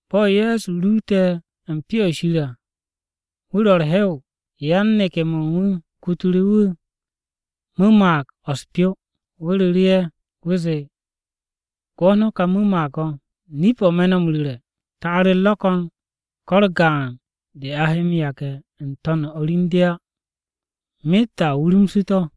Bo̱ Ye̱so ruute̱ u̱n Pyo-o̱ Shir à, wu̱ ro̱ u̱r-hew. Yan-neke̱-mo̱ u̱n wu̱ kutu̱ru̱ wu̱ mu̱mag-o̱ u̱s-pyo. Wu̱ ru̱ru̱ ye̱, wu̱ zee, “Gwo̱t no̱ kà mu̱mag-to̱. Nip-o̱ me̱ no̱ m-ru̱re̱, ta'ar-u̱r ro̱ ko̱n ko̱ u̱r-gaan de a he m-yage̱ n-to̱n u̱n o̱r u̱n de á. Myet a wurumsu̱ to̱.”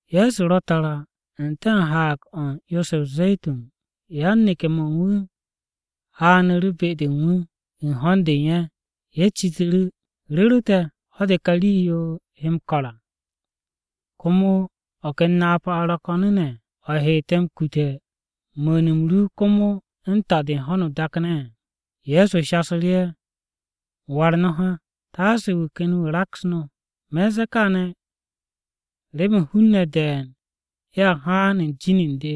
Ye̱so ro̱ tara n-te̱ u̱n Haag-o̱ u̱n 'yo-se o-Ze̱tun, yan-neke̱-mo̱ u̱n wu̱ haanu̱ru̱ be-de u̱n wu̱, u̱n ho̱n-de u̱n ye̱. Ye̱ citu̱ru̱, “¿Ru̱ru̱ te̱, ho̱-de kà rii-yo he m-ko̱r à, Komo o̱ ken napa-o̱ ro̱ ko̱n o̱ he te̱ m-kute̱ mu̱u̱n-m ru komo u̱n ta-de u̱n ho̱no o-dak ne̱?” Ye̱so shasu̱ru̱ ye̱, “War no̱ ha, taase wu̱ ken wu̱ raks no̱. Me̱n ze̱e̱ kaane̱ remen hun-ne̱ de̱e̱n ye̱a haan u̱n jin u̱n de.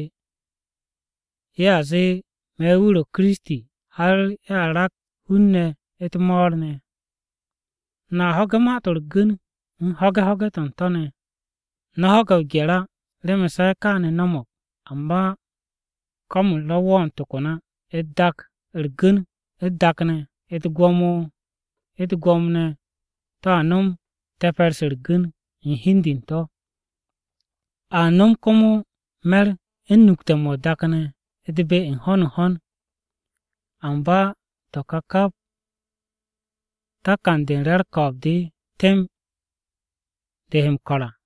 Ye̱a zee, ‘Me̱ wu̱ ro̱ Kiristi.’ Har ye̱a raks hun-ne̱ u̱t-mo̱o̱r ne̱. No̱a ho̱ge̱ ma-to̱ u̱r-gu̱n, u̱n ho̱ge̱ ho̱ge̱ to̱ u̱n to̱ ne̱. No̱ ho̱ge̱ o-gye̱r á, remen se̱ kaane̱ no̱mo̱g, amba ko̱m-u̱r ro̱ wo̱o̱n to̱ ko̱n á. U̱t-dak u̱r-gu̱n u̱t-dak ne̱, u̱t-gwo̱mo u̱t-gwo̱mo ne̱ to̱a nom te̱pe̱r-se u̱r-gu̱n u̱n hi u̱n de u̱n to̱. A nom komo me̱r u̱n nukte̱-mo̱ o-dak ne̱ u̱t-be n-ho̱n n-ho̱n. Amba to̱ ka kap takan-de u̱n re̱ u̱r-ko̱o̱b de temb de he m-ko̱r à.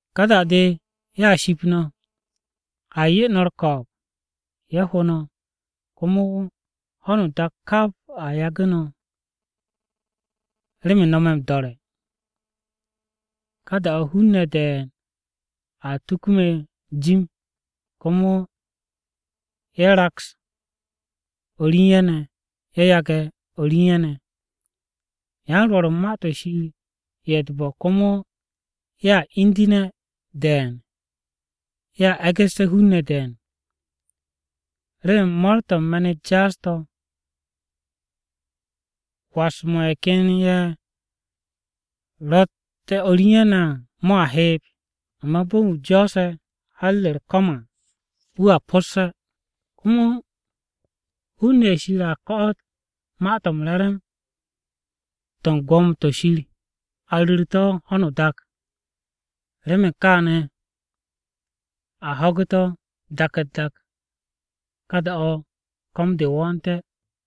“Ka da-de ye̱a ship no̱, a 'ye no̱ u̱r-ko̱o̱b, ye̱ ho no̱. Komo, ho̱no o-dak kap a yagu̱ no̱ remen no̱ me̱ m-do̱re̱. Ka da-o̱ hun-ne̱ de̱e̱n a tuku me̱ jim, komo ye̱ raks o̱r u̱n ye̱ ne̱, ye̱ yage̱ o̱r u̱n ye̱ ne̱. Yan-rwo̱r u̱n Ma-to̱ Shir ye̱ u̱t-bo̱ komo ye̱a indu̱ne̱ de̱e̱n, ye̱a e̱gu̱sse̱ hun-ne̱ de̱e̱n. Remen mo̱o̱r-to̱ u̱n me̱n-u̱t jaas-to̱, was-mo̱ ye̱ ken ye̱ ro̱ m-was u̱n o̱r u̱n ye̱ ne̱ à mo̱a heeb. Amba bo̱ u̱n wu̱ jo̱o̱se̱ har ha-mo̱ u̱r-ko̱m à, wu̱a po̱sse̱. Komo hun-ne̱ ye̱ Shir a ko̱'o̱t kà Ma-to̱ m-Re̱re̱m to̱ u̱n gwo̱mo-to̱ Shir to̱ a ru̱r to̱ ho̱no o-dak, remen a ho̱gu̱té̱ to̱ dak-u̱t-dak, ka da-o̱ ko̱m-de wo̱o̱nte̱.”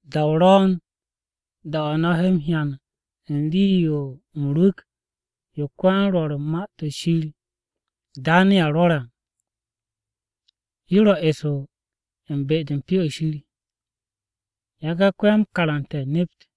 “Da-o ro̱o̱n da-o̱ no̱ he m-hyan u̱n rii-yo m-rwu̱k yo ko-yan-Rwo̱r u̱n Ma-to̱ Shir Daneya rwo̱re̱ à, yo ro̱ eso u̱n be-de Pyo-o̱ Shir (Yage̱ ko-ya-m-karante̱ nept.)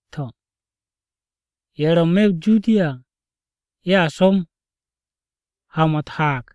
To̱, ye̱ ro̱ n-me̱ o-Judiya à, ye̱a som ha-mo̱ u̱t-haag.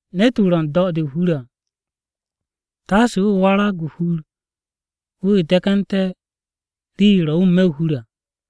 Ne̱t-wu̱ ro̱ n-do̱ o-hur à taase wu̱ warag o-hur wu̱ de̱ke̱nte̱ rii-yo ro̱ wu̱ n-me̱ o-hur à.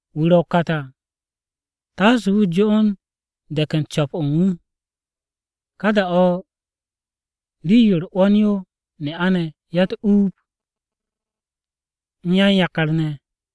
Wu̱ ro̱ o-kat à taase wu̱ jo'on dek u̱n co̱p-o̱ u̱n wu̱. Ka da-o̱ rii-yo u̱r-'wo̱n yo ne'a-ne̱ ya-u̱t-uub, u̱n ye̱ ro̱ u̱n yakar re̱k-ye̱ ne̱ à!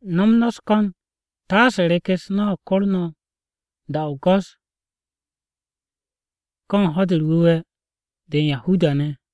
No̱m no̱ u̱s-ko̱n taase rek-u̱s no̱ kor no̱ da-o̱ o-go̱s ko̱ u̱n Ho̱-de u̱r-Wu̱we̱ de u̱n Yahuda-ne̱ [ho̱-de o-Sati].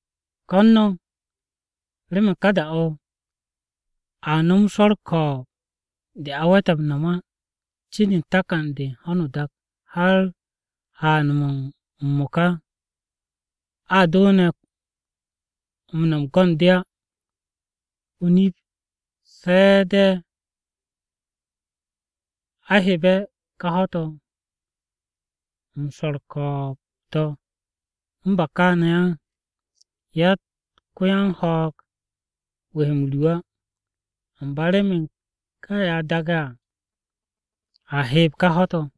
Ko̱n no̱ remen u̱n ka da-o̱, a nom swo̱ u̱r-ko̱o̱b de a we̱te̱ m-no̱m á cin u̱n takan-de u̱n ho̱no o-dak har haan-mo̱ m-mo̱ka, a do ne̱ m-no̱m go̱n-de á. O-nip, se̱ de̱ a hebe̱ ká ho̱-to̱ m-swo̱ u̱r-ko̱o̱b to̱ u̱n ba kaane̱ à, yatt ko-yan-ho̱o̱g wu̱ he m-ru á, amba remen ka ye̱ a daage̱ à, a heeb ka ho̱-to̱.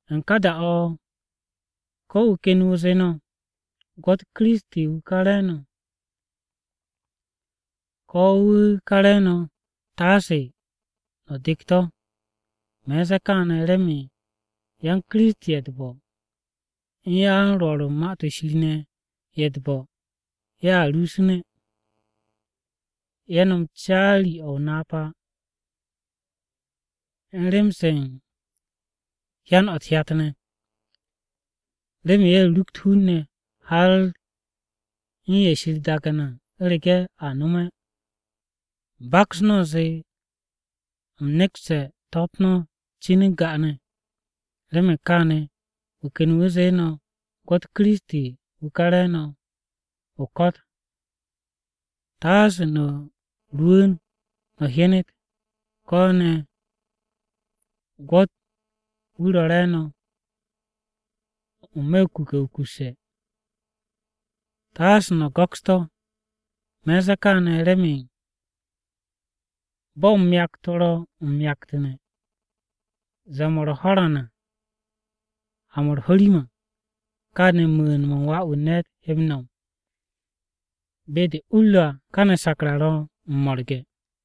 “U̱n ka da-o̱, ko̱ wu̱ ken wu̱ zee no̱, ‘Gwo̱t, Kiristi wu̱ ka káne̱!’ Ko̱, ‘Wu̱ ka re̱e̱no̱!’ Taase no̱ dek to̱. Me̱n ze̱e̱ kaane̱ remen yan Kiristi ye̱ u̱t-bo̱, u̱n yan-Rwo̱r u̱n Ma-to̱ Shir ne̱ ye̱ u̱t-bo̱ ye̱a rusune̱. Ye̱ nom caari-o̱ o-napa u̱n rem-se u̱n hyan u̱t-hyat ne̱, remen ye̱ rukt hun-ne̱, har u̱n ye̱ Shir daage̱ ne̱ à u̱rege̱ a nome̱. Baks no̱ u̱nze u̱m nekste̱ to̱-u̱t no̱ cin u̱n ga'ane̱. “Remen kaane̱, wu̱ ken wu̱ zee no̱, ‘Gwo̱t Kiristi Wu̱ ka re̱e̱no̱ o-ko̱t!’ Taase no̱ rwu̱u̱n no̱ hyenet. Ko̱ ne̱, ‘Gwo̱t wu̱ ro̱ re̱e̱no̱ n-me̱ o-kuke̱ wukusse̱,’ taase no̱ go̱ks to̱! Me̱n ze̱e̱ kaane̱ remen bo̱ myakt-o ro̱ m-myaktu̱ne̱ zee-mo̱ u̱r-ho̱ran ha-mo̱ u̱r-ho̱rim à, káane̱ mu̱u̱n-mo̱ u̱n Wà-wu̱ u̱n ne̱t he m-no̱m. Be-de u-u̱r ro̱ à, ay, káne̱ sakra ro̱ m-mo̱rge̱.”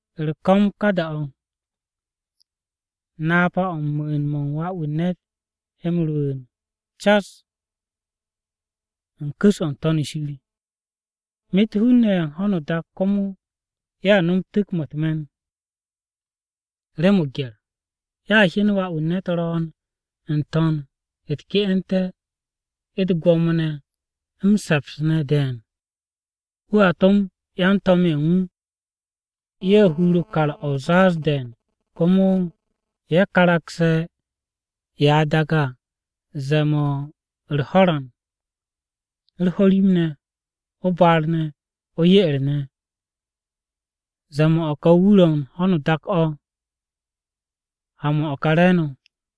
U̱r-ko̱m ka da-o̱, napa-o̱ m-mu̱u̱n mo̱ u̱n Wà-wu̱ u̱n ne̱t he m-rwu̱u̱n cas u̱n ku̱s-o̱ n-To̱n shir. Myet hun-ne̱ ye̱ u̱n ho̱no o-dak à komo ye̱a nom tu̱k-mo̱ u̱t-me̱n rem o-gye̱r. Ye̱a hyen Wà-wu̱ u̱n ne̱t ro̱o̱n n-to̱n u̱t-ke'ente̱ u̱t-gwo̱mo ne̱ m-se̱ps ne̱ de̱e̱n. Wu̱a to̱m yan-to̱m-ye̱ u̱n wu̱, ye̱ hur o-kar o̱ o-zaaz de̱e̱n, komo ye̱ karagse̱ ye̱ a daage̱ à ze̱e̱n-mo̱ u̱r-ho̱ran, u̱r-ho̱rim ne̱, o-baar ne̱, o-ye'er ne̱, zee-mo̱ u̱n o̱ ka wur-o̱ u̱n ho̱no o-dak o̱ ha-mo̱ u̱n o̱ ka re̱e̱no̱.”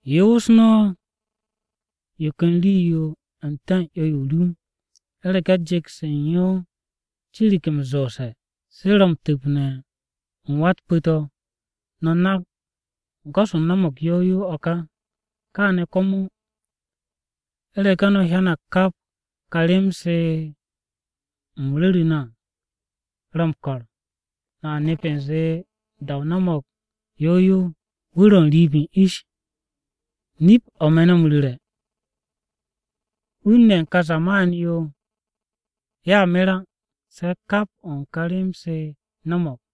“Yoos no̱ yo ken rii-yo n-te̱ u̱n 'yo-yo o-rum. U̱rege̱ jet-se u̱n yo cirig m-zoose̱, se̱ ro̱ m-tu̱pne̱ u̱n wá-u̱t pu̱-to̱, no̱ nak go̱s-o no̱mo̱g yow yow o̱ ka. Káane̱ komo, u̱rege̱ no̱ hyanag kap ká rem-se u̱m ru̱ru̱ no̱ à, ro̱ m-ko̱r, no̱a nep u̱nze da-o no̱mo̱g yow yow, wu̱ ro̱ n-riib u̱n ish. Nip-o̱ me̱ no̱ m-ru̱re̱, hun-ne̱ ye̱ u̱n ka zaman-yo ye̱a mer á, se̱ kap o̱ u̱n ká rem-se no̱mo̱g.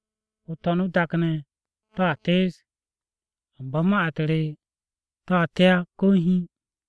O-to̱n o-dak ne̱ to̱a tees, amba ma-u̱t re to̱a te á ko̱ hiin.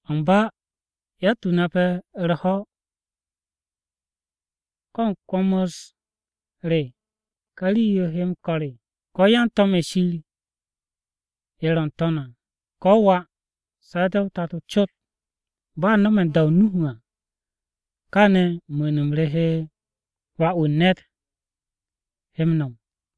“Amba yatt-wu̱ nape̱ u̱r-ho̱, ko̱ u̱n kwo̱m-u̱s re ká rii-yo he m-ko̱r á, ko̱ yan-to̱m-ye̱ Shir ye̱ ro̱ n-To̱n à, ko̱ Wà, se̱ de̱ o-Tato cot. “Bo̱ a no̱me̱ u̱n da-o Nuhu à, káane̱ mu̱u̱n-m re, me̱ Wà-wu̱ u̱n ne̱t he m-no̱m.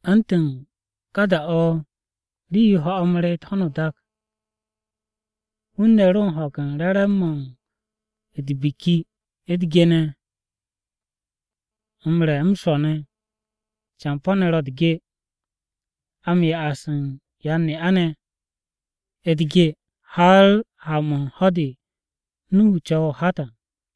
U̱ntu̱n ka da-o̱ rii-yo ho̱-mo̱ reet ho̱no o-dak, hun-ne̱ ro u̱n ho̱ge̱ u̱n re̱re̱m-mo̱ u̱t-biki u̱t-ge ne̱, m-re̱, m-swo̱ ne̱, campo̱-ne̱ ro̱ u̱t-ge, a m-'ya u̱n yan-ne'a-ne̱ u̱t-ge, har ha-mo̱ u̱n ho̱-de Nuhu co̱we̱ o-hat à!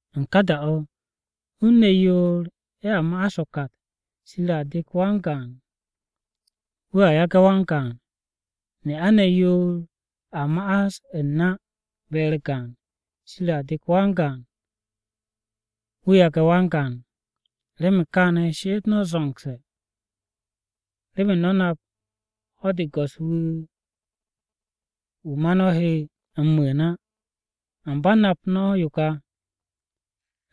U̱n ka da-o̱, hun-ne̱ yoor ye̱a ma'as o-kat, Shir a dek wan-gaan, wu̱a yage̱ wan-gaan. Ne'a-ne̱ yoor a ma'as u̱r-na be-u̱r gaan, Shir a dek wan-gaan, wu̱a yage̱ wan-gaan. “Remen kaane̱ she'et no̱ zo̱ngse̱, remen no̱ nap ho̱-de Go̱s-wu̱ wu̱ ma no̱ he m-mu̱u̱n á. Amba nap no̱ yo ka,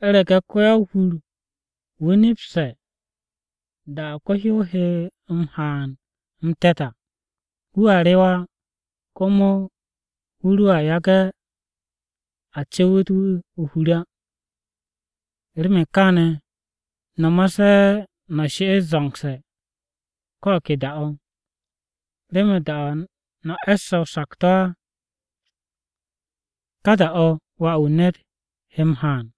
u̱rege̱ ko-ya-o-hur-wu̱ nepse̱ da-o̱ ko-hyow he m-haan m-te̱t à, wu̱a rewe̱ á. Komo wu̱ roa yage̱ a cu̱wu̱t wu̱ o-hur á. Remen kaane̱ no̱ ma se̱ no̱ she'et zo̱ngse̱, ko̱ o̱ ke da-o̱. Remen da-o̱ no̱ e̱sse̱ o-sakto̱ á, ka da-o̱ Wà-wu̱ u̱n ne̱t he m-haan.”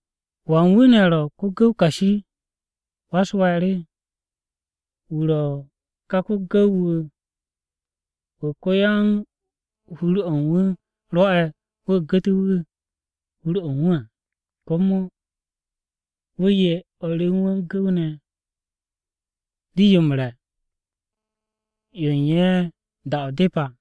“¿Wan wu̱ ne̱ ro̱ ko-gu̱w kashi, wa-u̱s-we̱e̱r? Wu̱ ro̱ ká gu̱w-wu̱ wu̱ ko-yan u̱n hur-o̱ u̱n wu̱ rwo̱'e̱ wu̱ gu̱tu̱ wu̱ hur-o̱ u̱n wu̱ à, komo wu̱ 'ye o̱r re u̱n wu̱ gu̱w-ne̱ rii-yo m-re̱ yo u̱n ye̱ u̱n da-o̱ depe̱ à.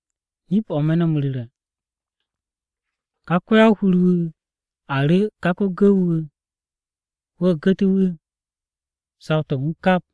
Nip-o̱ me̱ no̱ m-ru̱re̱, ká ko-ya-o-hur-wu̱ a ru̱ ká ko-gu̱w-wu̱, wu̱ gu̱tu̱ wu̱ saw-to̱ u̱n wu̱ kap.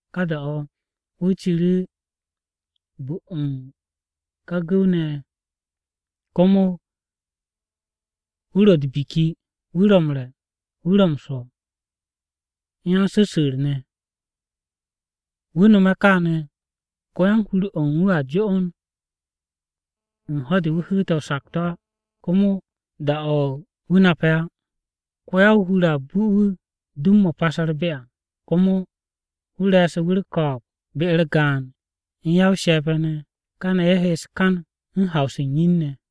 Ka da-o̱, wu̱ ciru̱ bu u̱n ye̱ ká gu̱w-ne̱ ye̱. Komo wu̱ ro̱ u̱t-biki, wu̱ ro̱ m-re̱, wu̱ ro̱ m-swo̱, u̱n yan-su̱su̱u̱r-ne̱. Wu̱ nome̱ kàane̱, ko-yan-hur-o̱ u̱n wu̱ a jo'on u̱n ho̱-de wu̱ hu̱u̱te̱ o-sakto̱ á, komo da-o̱ wu̱ nape̱ á. Ko-ya-o-hur a bu wu̱ dum-mo̱ pase̱ u̱r-be à, komo wu̱ re̱e̱su̱ wu̱ u̱r-ko̱o̱b be-u̱r gaan u̱n ya-o-she̱pe̱ ne̱. Káne̱ ye̱ he u̱s-kan u̱n haw-se u̱n yin-ne̱.